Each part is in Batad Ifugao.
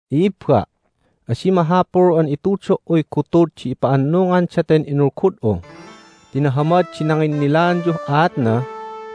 I'ibba', adi mahapul an itudo"uy gutud di ipa'annungan daten inulgud'u ti nahamad di nanginnilaanyuh aatna,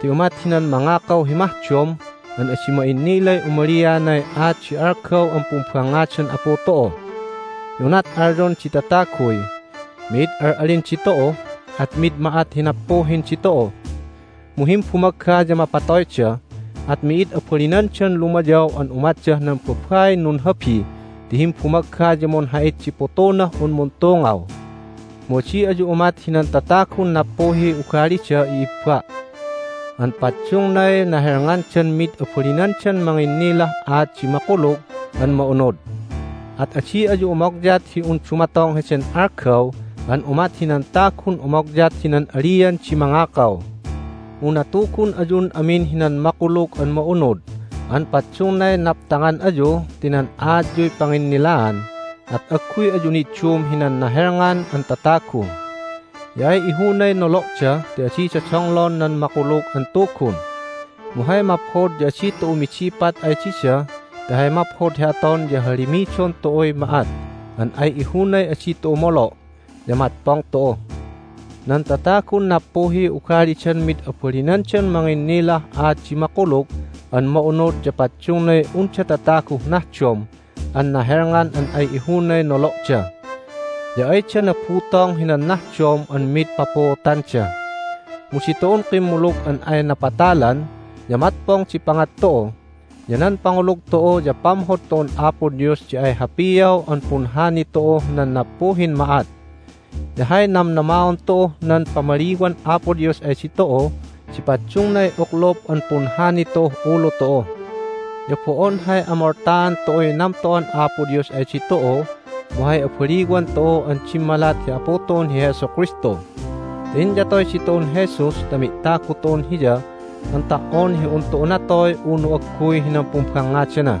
ti umat hinan mangakaw hi mahdom an adi ma'innilay umalianay aat di algaw an pumbangngadan Apu tu'u. Ya unat alyon di tataguy, "Mi'id al'alin ditu'u, at mid ma'at hi nappuhin ditu'u!" mu himbumagga ya mapatoyda, at mi'id abalinandan lumayaw an umatdah nan babain nunhabi ti himbumagga ya munha'it di putunah un muntungaw. Mu adi ayu umat hinan tatagun nappuhiy ugalida, i'ibba', an paddungnay nahelngandan mid abalinandan manginnilah aat di Makulug an Ma'unud. At adi ayu umogyat hi un dumatong heden algaw an umat hinan tagun umogyat hinan alian di mangakaw. Mu natugun ayun amin hinan Makulug an Ma'unud an paddungnay naptangan ayu ti nan aatyuy panginnilaan, at agguy ayu niddum hinan nahelngan an tatagu. Ya ay ihunay nolo'da ti adida donglon nan Makulug an Tugun. Mu hay maphod ya adi tu'u midipat ay dida ti hay maphod hi aton ya hahalimidon tu'uy ma'at an ay ihunay adi tu'u molo', ya matpong tu'u. Nan tatagun nappuhiy ugalidan mid abalinandan manginnilah aat di Makulug an Ma'unud ya paddungnay unda tataguh nahdom an nahelngan an ay ihunay nolo'da. Ya ayda nabutong hinan nahdom an mid papuutanda. Mu ditu'un kimmulug an ay napatalan ya matpong di pangat tu'u, ya nan pangulug tu'u ya pamhod tu'un Apo Dios di ay hapiaw an punhani tu'uh nan nappuhin ma'at. Ya hay namnamaon tu'uh nan pamaliwan Apo Dios ay ditu'u di paddungnay uklup an punhani tu'uh ulu tu'u. Ya bo'on hay amoltaan tu'uy namto'an Apo Dios ay ditu'u mu hay abaliwan tu'u an dimmalat hi Apu tu'un hi Jesu Kristu. Ti inyatoy ditu'un Jesus ta mi'tagu tu'un Hiya an ta"on hi un tu'u natoy unu agguy hinan pumbangngadana.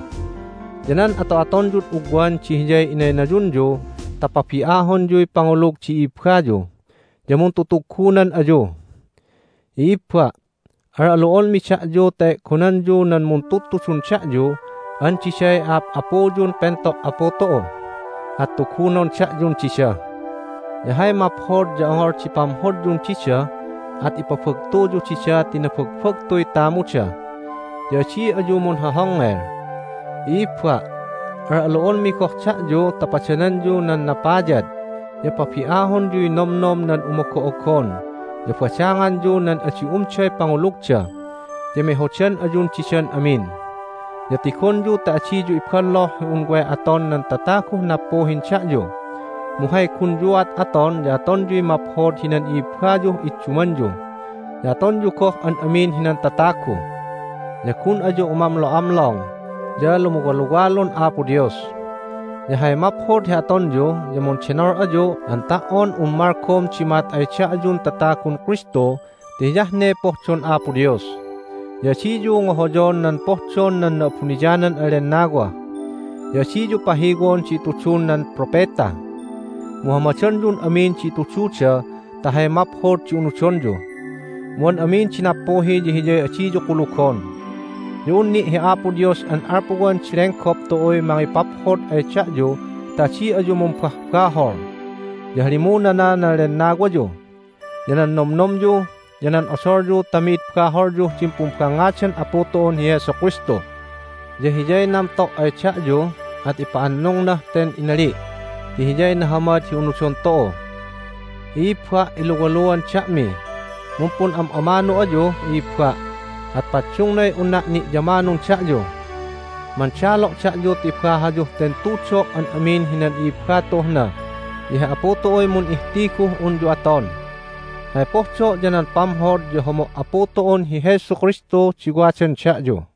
Ya nan ato'atonyud ugwan di hiyay inaynayunyu ta pabi'ahonyuy pangulug di i'ibayu, ya muntutuggunan ayu. I'ibba', al'alu'onmi da'yu ta e'gonanyu nan muntudtudun da'yu an diday a'ap'apuyun pento' Apu tu'u, at tugunon da'yun dida. Ya hay maphod ya ongol di pamhodyun dida, at ipabagtuyu dida ti nabagbagtuy tamuda. Ya adi ayu munhohongngel. I'ibba', al'alu'onmi goh da'yu ta padananyu nan napayad, ya pabi'ahonyuy nomnom nan umogo'ogon, ya badanganyu nan adi umday pangulugda, ya mehodan ayun didan amin. Ya tigonyu ta adiyu ibolloh hi un way aton nan tataguh nappuhin da'yu, mu hay gunyuat aton ya atonyuy maphod hinan i'ibbayuh iddumanyu, ya atonyu goh an amin hinan tatagu. Ya gun ayu umamlo'amlong, ya lumuwaluwalun Apo Dios. Ya hay maphod hi atonyu ya mundenol ayu an ta"on un malgom di ma'at ay da'yun tatagun Kristu ti hiyah ne pohdon Apo Dios. Ya adiyu ngohoyon nan pohdon nan Na'abuniyanan an Lennawa. Ya adiyu pahiwon di itudun nan propeta, mu hamadonyun amin di itududa ta hay maphod di unudonyu, mu an amin di nappuhi ya hiyay adiyu kulugon. Ya un ni' hi Apo Dios an alpuwan di lenggop tu'uy mangipaphod ay da'yu ta adi ayu mumbahbahol. Ya halimunana nan lennawayu, ya nan nomnomyu, ya nan odolyu ta mi'id baholyuh din pumbangngadan Apu tu'un hi Jesu Kristu. Ya Hiyay namto' ay da'yu, at ipa'annungnah ten inali' ti Hiyay nahamad hi unudon tu'u. I'ibba', iluwaluan da'mi. Mumpun'am'amanu ayu, i'ibba', at paddungnay unna' ni'yamanun da'yu. Mandalo' da'yu ta ibahayuh ten tudo' an amin hinan i'ibba tu'uh na, ya hi Apu tu'uy mun'ihtiguh unyu aton. Hay pohdo' ya nan pamhod ya homo' Apu tu'un hi Jesu Kristu di wadan da'yu.